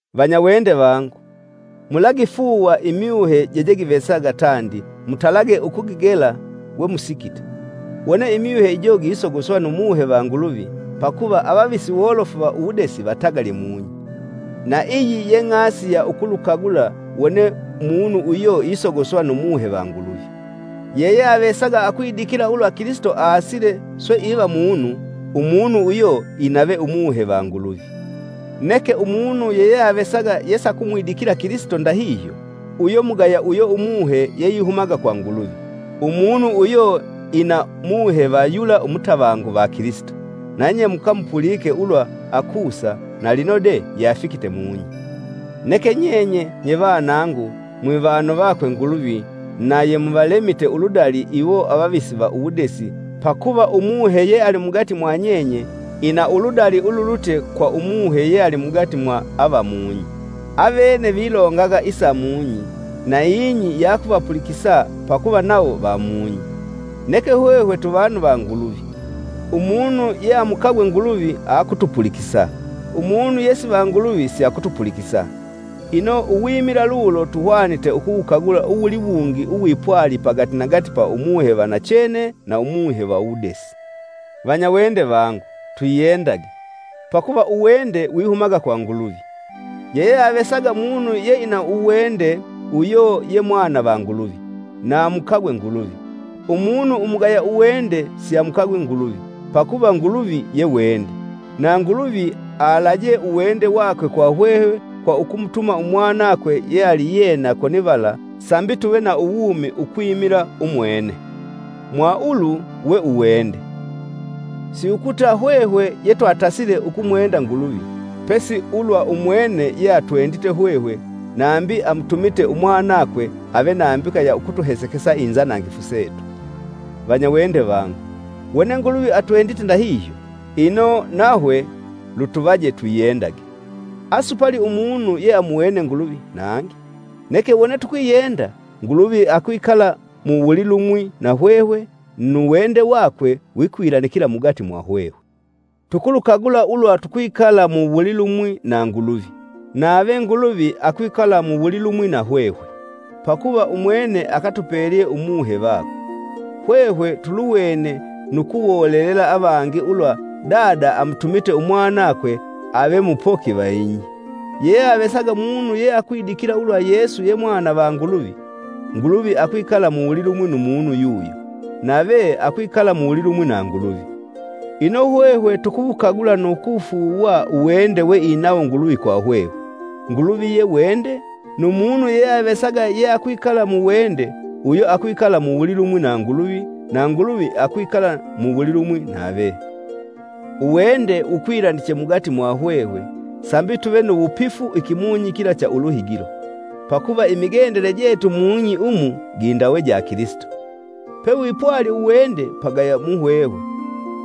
Vanyawende vangu, mulagifuuwa imyuhe jejegivesaga tandi mutalage ukugigela we musikite, wone imyuhe ijo gisogoswa nu Muhe va Nguluvi, pakuva avavisi wolofu va uwudesi vatagalye mung'i. Na iyi ye ng'asi ya ukulukagula wone munu uyo isogoswa nu Muhe va Nguluvi. Yeyeavesaga akwidikila ulwa Kilisito aasile, swe iva munu, umunu uyo inave Umuhe va Nguluvi. Neke umunu yeyeavesaga yesakumwidikila Kilisito ndahihyo, uyo mugaya uyo Umuhe yeihumaga kwa Nguluvi. Umunu uyo ina muhe yula umutavangu va Kilisito; nanye yemukemukapulike ulwa akusa, na linode yeafikite mung'i! Neke nyenye, nye vanangu, mwivanu vakwe Nguluvi na yemuvalemite uludali iwo avavisi va uwudesi; pakuva Umuhe yealimugati mwanyenye ina uludali ululutye kwa umuhe yealimugati ava mung'i. Avene vilongaga isa mung'i, na ing'i yakuvapulikisa pakuva nawo va mung'i. Neke hwehwe twivanu va Nguluvi. Umunu yeamukagwe Nguluvi akutupulikisa, umunu yesiva Nguluvi siakutupulikisa. Ino, uwimila lulo tuhwanite ukuwukagula uwuliwungi uwipwali pagatinagati pa umuhe va nachene na umuhe va uwudesi. Vanyawende vangu, twiyendage, pakuva uwende wihumaga kwa Nguluvi. Yeyeavesaga munu yeina uwende uyo ye mwana va Nguluvi, na amukagwe Nguluvi. Umunu umugaya uwende siamukagwi Nguluvi, pakuva Nguluvi ye wende. Na Nguluvi alajee uwende wakwe kwa hwehwe kwa ukumutuma Umwanakwe yealiyena konivala, sambi tuve na uwumi ukwimila umwene. Mwa ulu we uwende! Siukuta hwehwe yetwatasile ukumwenda Nguluvi, pesi ulwa umwene yeatwendite hwehwe nambi amutumite Umwanakwe ave nambika ya ukutuhesekesa inzanangifu setu. Vanyawende vangu, wone Nguluvi atwendite ndahihyo, ino, nahwe lutuvaje twiyendage. Asupali umunu yeamuwene Nguluvi nangi; neke wone tukwiyenda, Nguluvi akwikala mu wulilumwi nahwehwe, nu wende wakwe wikwilanikila mugati mwahwehwe. Tukulukagula ulwa tukwikala mu wulilumwi na Nguluvi, nave Nguluvi akwikala mu wulilumwi nahwehwe, pakuva umwene akatupelye Umuhe vakwe. Hwehwe tuluwene nu kuwolelela avangi ulwa Dada amutumite Umwanakwe ave mupoki va ing'i. Yeyeavesaga munu yeakwidikila ulwa Yesu ye Mwana va Nguluvi, Nguluvi akwikala muwulilumwi nu munu yuyo, nave akwikala muwulilumwi na Nguluvi. Ino, hwehwe tukuwukagula nu kuwufuuwa uwende we inawo Nguluvi kwa hwehwe. Nguluvi ye wende, nu munu yeyeavesaga yeakwikala mu wende, uyo akwikala muwulilumwi na Nguluvi, na Nguluvi akwikala muwulilumwi nave. Uwende wukwilaniche mugati mwahwehwe sambi tuve nu wupifu ikimunyi kila cha Uluhigilo; pakuva imigendele jetu mung'i umu gindawe ja Kilisito. Pewipwali uwende pagaya muhwehwe,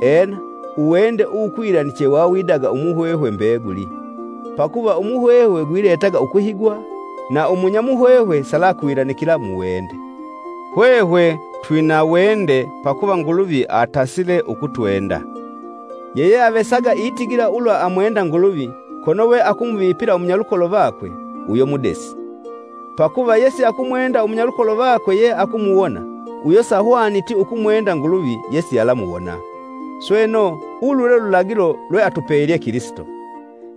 ena, uwende uwukwilaniche wawidaga umuhwehwe mbeguli. Pakuva umuhwehwe gwiletaga ukuhigwa, na umunyamuhwehwe salakwilanikila mu wende. Hwehwe twina wende pakuva Nguluvi atasile ukutwenda. Yeyeavesaga itigila ulwa Umunu wone atigile ulwa amwenda Nguluvi, kono we akumuvipila umunyalukolo vakwe, uyo mudesi. Pakuva yesiakumwenda umunyalukolo vakwe yeakumuwona, uyo sahwaniti ukumwenda Nguluvi yesialamuwona. Sweno, ulu lwe lulagilo lweatupelye Kilisito: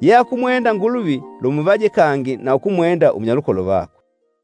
Yeakumwenda Nguluvi lumuvaje kangi na ukumwenda umunyalukolo vakwe.